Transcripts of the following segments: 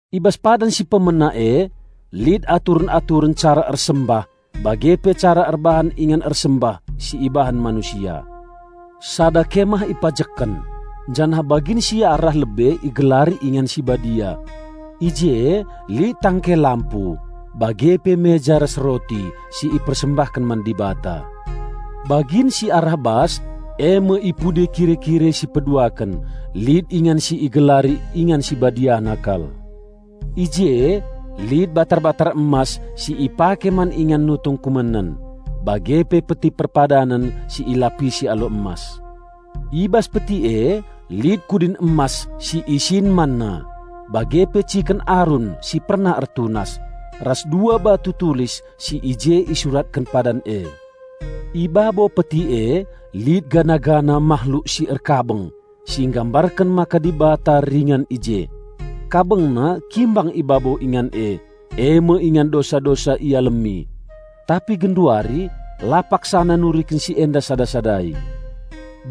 I bas padan si pemena e, lit aturen-aturen cara ersembah bage pe cara erbahan ingan ersembah si ibahan manusia. Sada kemah ipajekken, janah bagin si arah lebe igelari Ingan si Badia. I je lit tangke lampu, bage pe meja ras roti si ipersembahken man Dibata. Bagin si arah bas, e me i pudi kire-kire si peduaken, lit ingan si igelari Ingan Sibadiana kal. I je lit batar-batar emas si ipake man ingan nutung kumenen, bage pe Peti Perpadanen si ilapisi alu emas. I bas Peti e lit kudin emas si isin manna, bage pe ciken Arun si pernah ertunas, ras dua batu tulis si i je isuratken padan e. I babo Peti e lit patung mahluk si erkabeng, si nggambarken maka Dibata ringan i je. Kabengna kimbang i babo ingan e, e me ingan dosa-dosa ialemi. Tapi genduari la paksana nuriken si enda sada-sadai.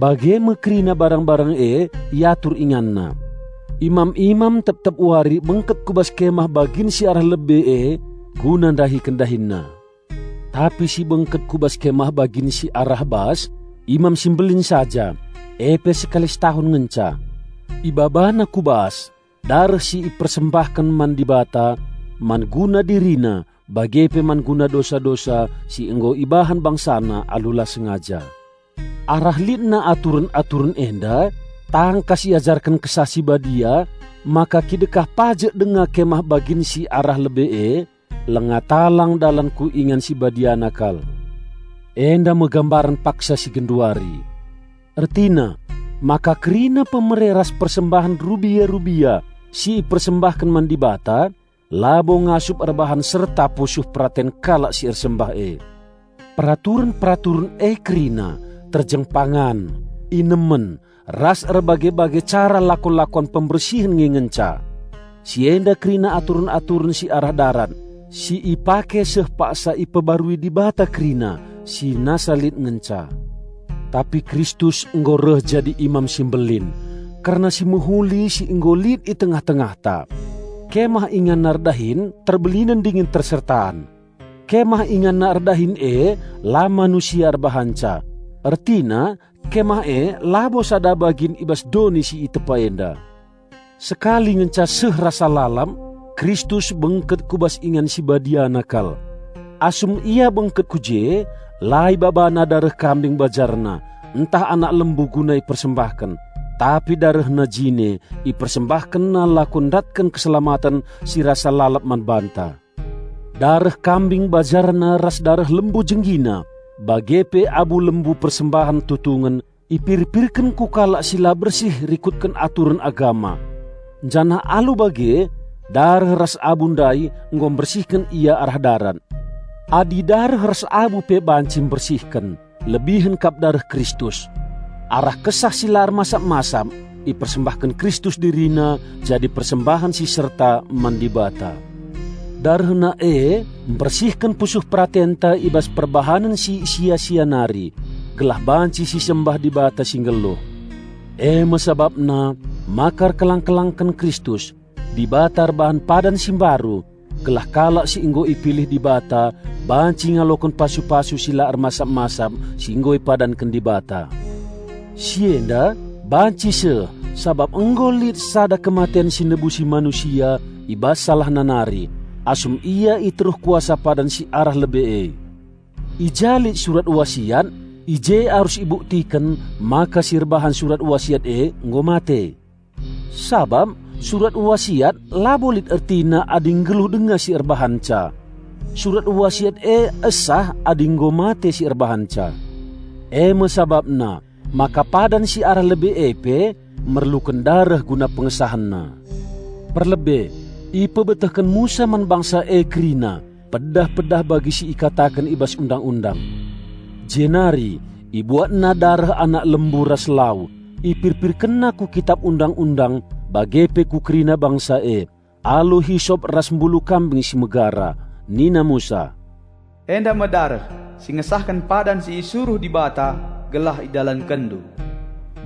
Bage me kerina barang-barang e iatur inganna. Imam-imam tep-tep wari bengket ku bas Kemah bagin si arah lebe e guna ndahiken dahinna. Tapi si bengket ku bas Kemah bagin si arah bas, Imam Simbelin saja, e pe sekali setahun ngenca. Ibabana ku bas dareh si ipersembahken man Dibata man guna dirina bage pe man guna dosa-dosa si nggo ibahan bangsana alu la sengaja. Arah litna aturen-aturen enda, tangkas iajarken Kesah Si Badia maka kidekah pajek denga Kemah bagin si arah lebe e, langa talang dalan ku Ingan Sibadiana kal. Endame gambaren paksa si genduari. Ertina, maka kerina pemere ras persembahen rubia-rubia si ipersembahken man Dibata labo ngasup erbahan serta pusuh peraten kalak si ersembah e. Peraturen-peraturen e kerina terjeng pangan, inemen ras erbage-bage cara lakon-lakon pembersihen nge ngenca. Si enda kerina aturen-aturen si arah darat, si ipake seh paksa ipebarui Dibata kerina si nasa lit ngenca. Tapi Kristus nggo reh jadi Imam Simbelin kerna si mehuli si nggo lit i tengah-tengahta. Kemah InganNa erdahin terbelinen dingen tersertaan. Kemah InganNa erdahin e la manusia erbahanca; ertina Kemah e labo sada bagin i bas doni si itepa enda. Sekali ngenca seh rasa lalap Kristus bengket ku bas Ingan Sibadiana kal. Asum Ia bengket ku je, la IbabaNa dareh kambing bajarna ntah anak lembu guna ipersembahken, tapi DarehNa jine IpersembahkenNa lako ndatken keselamaten si rasa lalap man banta. Dareh kambing bajarna ras dareh lembu jenggina bage pe abu lembu persembahen tutungen, ipirpirken ku kalak si la bersih rikutken aturen agama. Janah alu bage dareh ras abu ndai nggo mbersihken ia arah darat. Adi dareh ras abu pe banci mbersihken, lebihen kap dareh Kristus! Arah kesah si la ermasap-masap ipersembahken Kristus DiriNa jadi persembahen si serta man Dibata. DarehNa e mbersihken pusuh peratenta i bas perbahanen si sia-sia nari, gelah banci sisembah Dibata si nggeluh. E me sabapna maka erkelang-kelangken Kristus, Dibata erbahan padan si mbaru, gelah kalak si nggo ipilih Dibata banci ngaloken pasu-pasu si la ermasap-masap si nggo ipadanken Dibata. Si enda banci seh sabap nggo lit sada kematen si nebusi manusia i bas salahna nari, asum ia i teruh kuasa padan si arah lebe e. I ja lit surat wasiat i je arus ibuktiken maka si erbahan surat wasiat e nggo mate. Sabap surat wasiat labo lit ertina adi nggeluh denga si erbahanca. Surat wasiat e esah adi nggo mate si erbahanca. E me sabapna maka padan si arah lebe e pe merluken dareh guna pengesahenna. Perlebe, ipebetehken Musa man bangsa e kerina pedah-pedah bagi si ikataken i bas Undang-undang. Jenari ibuatna dareh anak lembu ras lau, ipirpirkenna ku Kitap Undang-undang bage pe ku kerina bangsa e, alu hisop ras mbulu kambing si megara. Nina Musa, "Enda me dareh si ngesahken padan si isuruh Dibata gelah idalankenndu."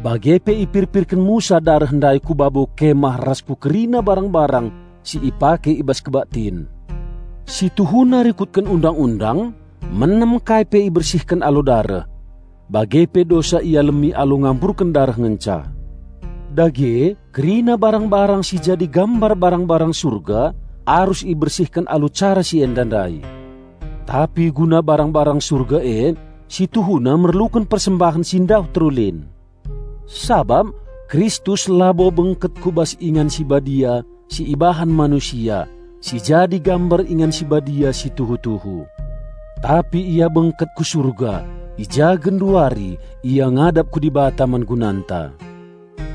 Bage pe ipirpirken Musa dareh ndai ku babo Kemah ras ku kerina barang-barang si ipake i bas kebaktin. Situhuna rikutken Undang-undang, menam kai pe ibersihken alu dareh. Bage pe dosa ialemi alu ngamburken dareh ngenca. Dage kerina barang-barang si jadi gambar barang-barang Surga arus ibersihken alu cara si enda ndai. Tapi guna barang-barang Surga e, situhuna merluken persembahen si ndauh terulin. Sabap Kristus labo bengket ku bas Ingan Sibadia si ibahan manusia, si jadi gambar Ingan Sibadia si tuhu-tuhu. Tapi Ia bengket ku Surga, i ja genduari ia ngadap ku Dibata man gunanta.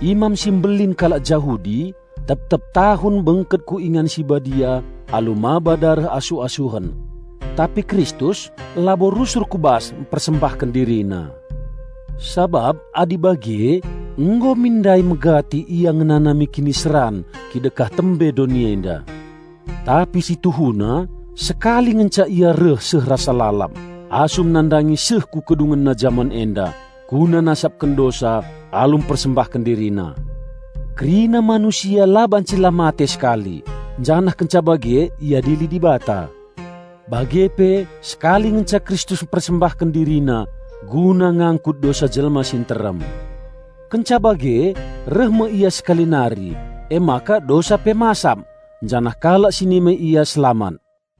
Imam si mbelin kalak Jahudi tep-tep tahun bengket ku Ingan si Badia alu maba dareh asuh-asuhen. Tapi Kristus labo rusur ku bas mpersembahken DiriNa. Sabap adi bage nggo mindai megati Ia ngenanami kiniseran kidekah tembe doni enda. Tapi situhuna sekali ngenca Ia reh seh rasa lalap, asum nandangi seh ku kedungenna jaman enda, guna nasapken dosa alu mpersembahken DiriNa. Kerina manusia la banci la mate sekali, janah kenca bage iadili Dibata. Bage pe sekali ngenca Kristus mpersembahken DiriNa guna ngangkut dosa jelma si nterem. Kenca bage reh me Ia sekali nari, emaka dosa pe masap, janah kalak si nimai Ia selamat.